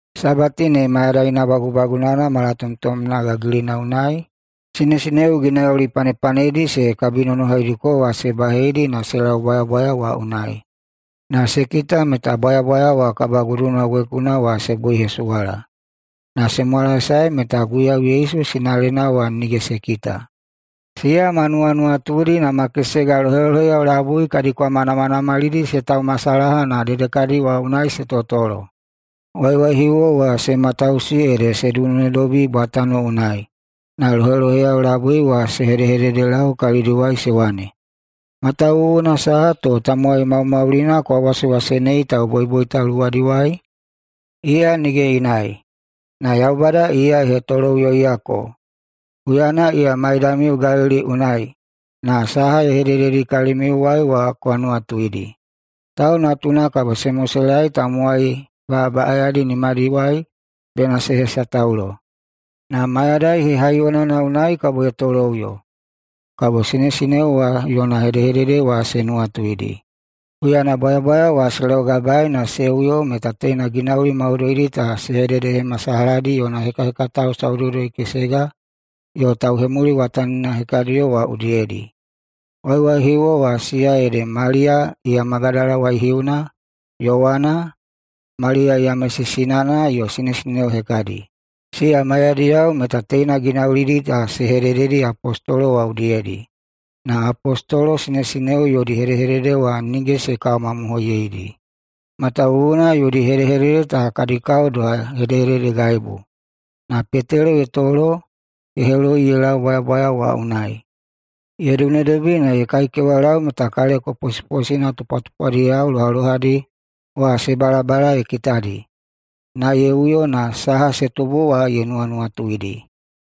Sabati ne mayadaina bagubagunana malatomtomna gagilina unai sinesineo ginauli panepanedi se kabinonohaidiko wa se baheidi na se lau bwayabwaya wa unai. Na se kita meta bwayabwaya wa kabaguduna wekuna wa se buihesuwala, na se mwalaesae meta Guiyau Yesu sinalena wa nige se kita. Siya ma nuwanuwatudi na ma kesega loheloheyao labui kadi kwama namanamalidi se taumasalaha na dedekadi wa unai se totolo. Waiwaihiuwo wa se matausi ede se dunedobi bwatano unai, na loheloheyao labui wa se hededelau kalidiwai se wane, “Matawuwuna saha to tamowai maumaulina kwa wasewasenei tauboiboita luwadiwai? Iya nige inai, na Yaubada iya ye hetoloꞌuyoiyako! Huyana iya maiyamiu Galili unai, na saha ye hedededi kalimiuwai wa kwa nuwatuidi: ‘Tau Natuna kabo se moselaei tamowai baꞌabaꞌayadi nimadiwai bena se hesataulo, na mayadai hehaiyonana unai kabo ye toloꞌuyo.’” Kabo sinesineo wa yona hedehedede wa se nuwatuidi. Huyana bwayabwaya wa se laugabaei na se uyo meta teina ginauli maudoidi ta se hededehemasalahadi yona hekahekatao saudoudoi-kesega yo tauhemuliwatanina hekadiyo wa udiyedi. Waiwaihiuwo wa siya ede Maliya iya Magadala waihiuna, Yowana, Maliya Yamesi sinana yo sinesineo hekadi, siya maiyadiyao meta teina ginaulidi ta se hedededi apostolo wa udiyedi. Na apostolo sinesineo yodi hedehedede wa nige se kawamamohoiyeidi, matawuwuna yodi hedehedede ta kadi kao doha hedehededegaibu. Na Petelo ye tolo na ye heloi ye lau bwayabwaya wa unai. Ye dunedobi na ye kaikewalau meta kaleko posiposina tupwatupwadiyao lohalohadi wa se balabala ye kitadi, na ye uyo, na saha se tubu wa ye nuwanuwatuidi.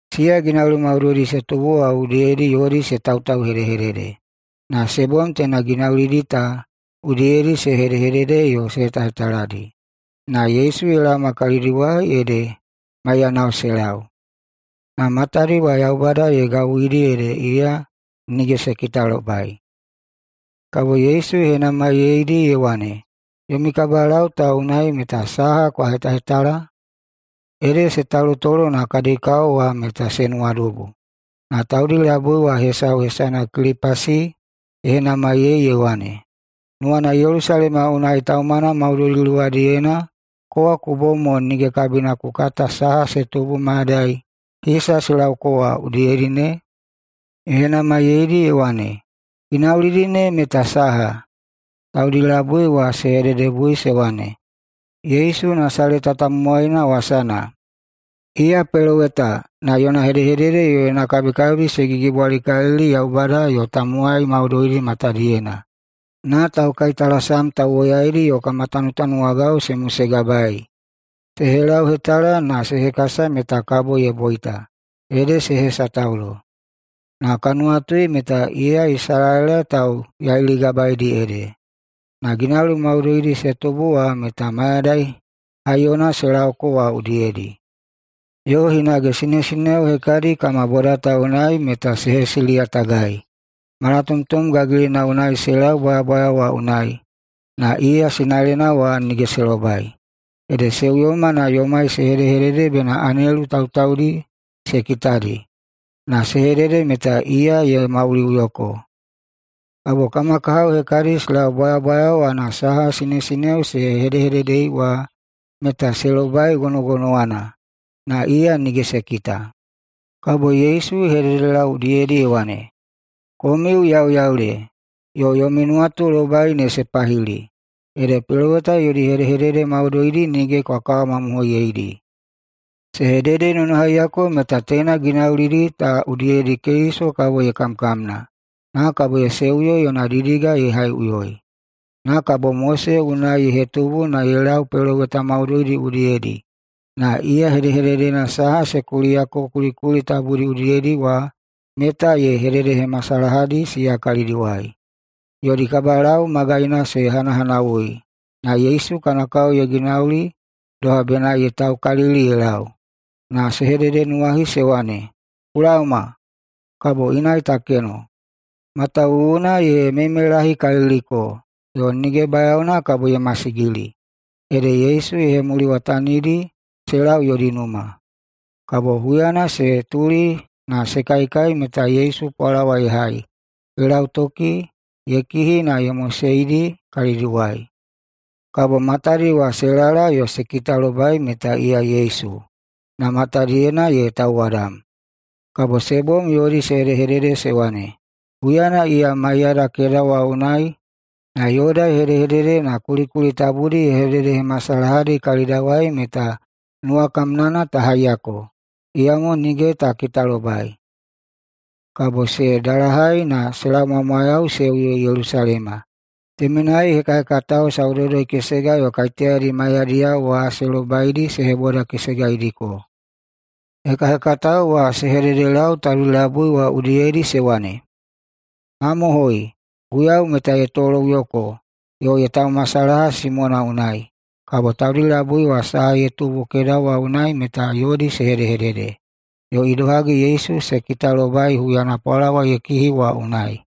Siya ginauli maudoidi se tubu wa udiyedi yodi se tautauhedehedede. Na se bom teina ginaulidi ta udiyedi se hedehedede yo se hetahetaladi, na Yesu ye laoma kalidiwai ede maiyanao se lau. Na matadi wa Yaubada ye gawuidi ede iya nige se kitalobai. Kabo Yesu ye henamaiyeidi ye wane, “Yomi kabalau ta unai meta saha kwa hetahetala?” Ede se talutolo na kadi kao wa meta se nuwadubu. Na taudi labui wa hesau, hesana Kilipasi, ye henamaiyei ye wane, “Nuwana Yelusalema unai taumana maudoidi luwadiyena kowa ku bom mo nige kabina ku kata saha se tubu mayadai hisa se laoko wa udiyedi ne?” Ye henamaiyeidi ye wane, “Ginaulidi ne meta saha?” Taudi labui wa se hededebui se wane, “Yesu Nasaleta tamowaina wasana. Iya peloweta na yona hedehedede yo yona kabikabi se gigibwalikalili Yaubada yo tamowai maudoidi matadiyena. Na taukaitalasam tauwoyaidi yo kama tanutanuwagao se mosegabaei. Se helauhetala na se hekasa meta kabo ye boita, ede se hesataulo. Na ka nuwatui meta iya Isalaela tauyailigabaeidi ede. Na ginauli maudoidi se tubu wa meta mayadai haiyona se lauko wa udiyedi. Yo hinage sinesineo hekadi kama boda ta unai meta se hesiliyatagai. Malatomtom gagilina unai se lau bwayabwaya wa unai, na iya sinalena wa nige se lobai, ede se uyoma na yomai se hedehedede bena anelu tautaudi se kitadi, na se hedede meta iya ye mauliꞌuyoko. Kabo kama kahao hekadi se lau bwayabwaya wa na saha sinesineo se hedehededei wa meta se lobai gonogonowana, na iya nige se kita.” Kabo Yesu ye hededelau udiyedi ye wane, “Komiu yauyaule, yo yomi nuwatulobai ne se pahili, ede peloweta yodi hedehedede maudoidi nige kwa kawamamohoiyeidi! Se hededenonohaiyako meta teina ginaulidi ta udiyedi Keliso kabo ye kamkamna, na kabo ye seuyo yona didiga ye haiꞌuyoi.” Na kabo Mose unai ye hetubu na ye lau peloweta maudoidi udiyedi na iya hedehededena saha se kuliyako kulikuli tabudi udiyedi wa meta ye hededehemasalahadi siya kalidiwai. Yodi kabalau magaina se hanahanawui, na Yesu kana kao ye ginauli doha bena ye taukalili ye lau. Na se hededenuwahi se wane, “Ku laoma, kabo inai ta keno. Matawuwuna ye meimeilahikaliliko yo nige bayaona kabo ye masigili.” Ede Yesu ye hemuliwatanidi se lau yodi numa. Kabo huyana se tuli na se kaikai meta Yesu pwalawa ye hai, ye lautoki, ye kihi, na ye moseidi kalidiwai. Kabo matadi wa se lala yo se kitalobai meta iya Yesu, na matadiyena ye tauwadam. Kabo se bom yodi se hedehedede se wane, “Huyana iya maiyada keda wa unai na yoda ye hedehedede na kulikuli tabudi ye hededehemasalahadi kalidawai meta nuwakamnana ta haiyako. [Iyamo nige ta kitalobai!]” Kabo se dalahai na se laumwamwayau se uyo Yelusalema. Temenai hekahekatao saudoudoi-kesega yo kaiteyadi maiyadiyao wa se lobaidi se hebodakesegaidiko. Hekahekatao wa se hededelau taudi labui wa udiyedi se wane, “Mamohoi! Guiyau meta ye toloꞌuyoko yo ye taumasalaha Simona unai.” Kabo taudi labui wa saha ye tubu keda wa unai meta yodi se hedehedede, yo idohagi Yesu se kitalobai huyana pwalawa ye kihi wa unai.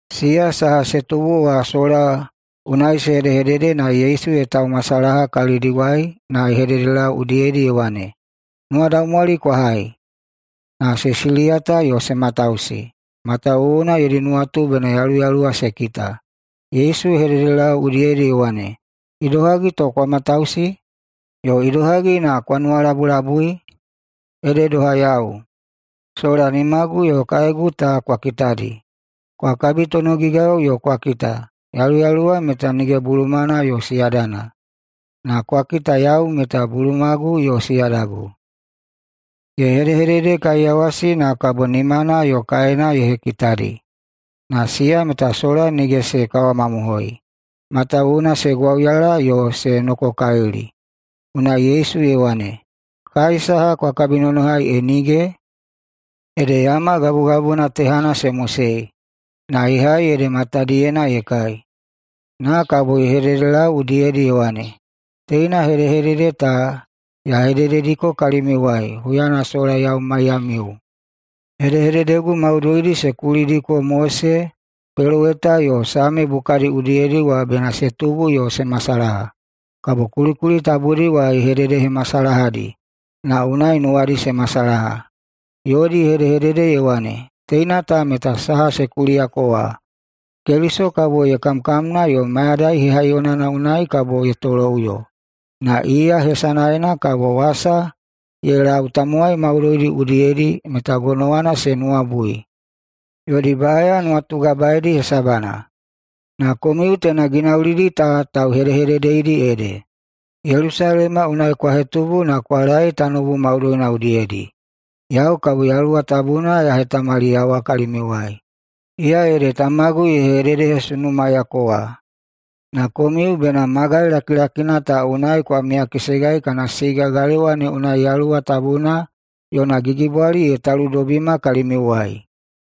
Siya saha se tubu wa sola unai se hedehedede na Yesu ye taumasalaha kalidiwai na ye hededelau udiyedi ye wane, “Nuwadaumwali kwa hai!” Na se siliyata yo se matausi, matawuwuna yodi nuwatu bena yaluyaluwa se kita. Yesu ye hededelau udiyedi ye wane, “Idohagi to kwa matausi, yo idohagi na kwa nuwalabulabui? Ede doha yau! Sola nimagu yo kaegu ta kwa kitadi. Kwa kabitonogigau yo kwa kita. Yaluyaluwa meta nige bulumana yo siyadana, na kwa kita yau meta bulumagu yo siyadagu.” Ye hedehededekaiyawasi, na kabo nimana yo kaena ye hekitadi. Na siya meta sola nige se kawamamohoi, matawuwuna se gwauyala yo se nokokalili, unai Yesu ye wane, “Kai saha kwa kabinonohai e nige?” Ede yama gabugabuna tehana se mosei, na ye hai ede matadiyena ye kai. Na kabo ye hededelau udiyedi ye wane, “Teina hedehedede ta ya hededediko kalimiuwai huyana sola yau maiyamiu: Hedehededegu maudoidi se kulidiko Mose, peloweta yo Same bukadi udiyedi wa bena se tubu yo se masalaha.” Kabo kulikuli tabudi wa ye hededehemasalahadi na unai nuwadi se masalaha. Yodi ye hedehedede ye wane, “Teina ta meta saha se kuliyako wa: Keliso kabo ye kamkamna yo mayadai hehaiyonana unai kabo ye toloꞌuyo. Na iya hesanaena kabo wasa ye lau tamowai maudoidi udiyedi meta gonowana se nuwabui, yodi baꞌaya nuwatugabaedi hesabana. Na komiu teina ginaulidi ta tauhedehededeidi ede. Yelusalema unai kwa hetubu na kwa laei tanoubu maudoina udiyedi. Yau kabo Yaluwa Tabuna ya hetamaliyawa kalimiuwai. Iya ede Tamagu ye hededehesunumayako wa. Na komiu bena magai lakilakina ta unai kwa miyakesegai kana siga galewa ne unai Yaluwa Tabuna yona gigibwali ye taludobima kalimiuwai.”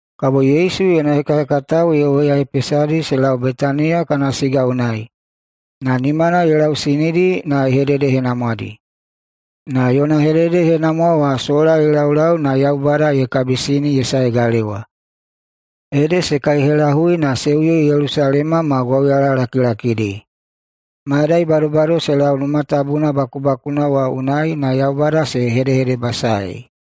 Kabo Yesu yona hekahekatao ye woyahepesadi se lau Betaniya kana siga unai, na nimana ye lausinidi na ye hededehenamwadi. Na yona hededehenamwa wa sola ye laulau na Yaubada ye kabisini ye sae galewa. Ede se kaihelahui na se uyo Yelusalema ma gwauyalalakilakidi. Mayadai badobado se lau Numa Tabuna bakubakuna wa unai na Yaubada se hedehedebasaei.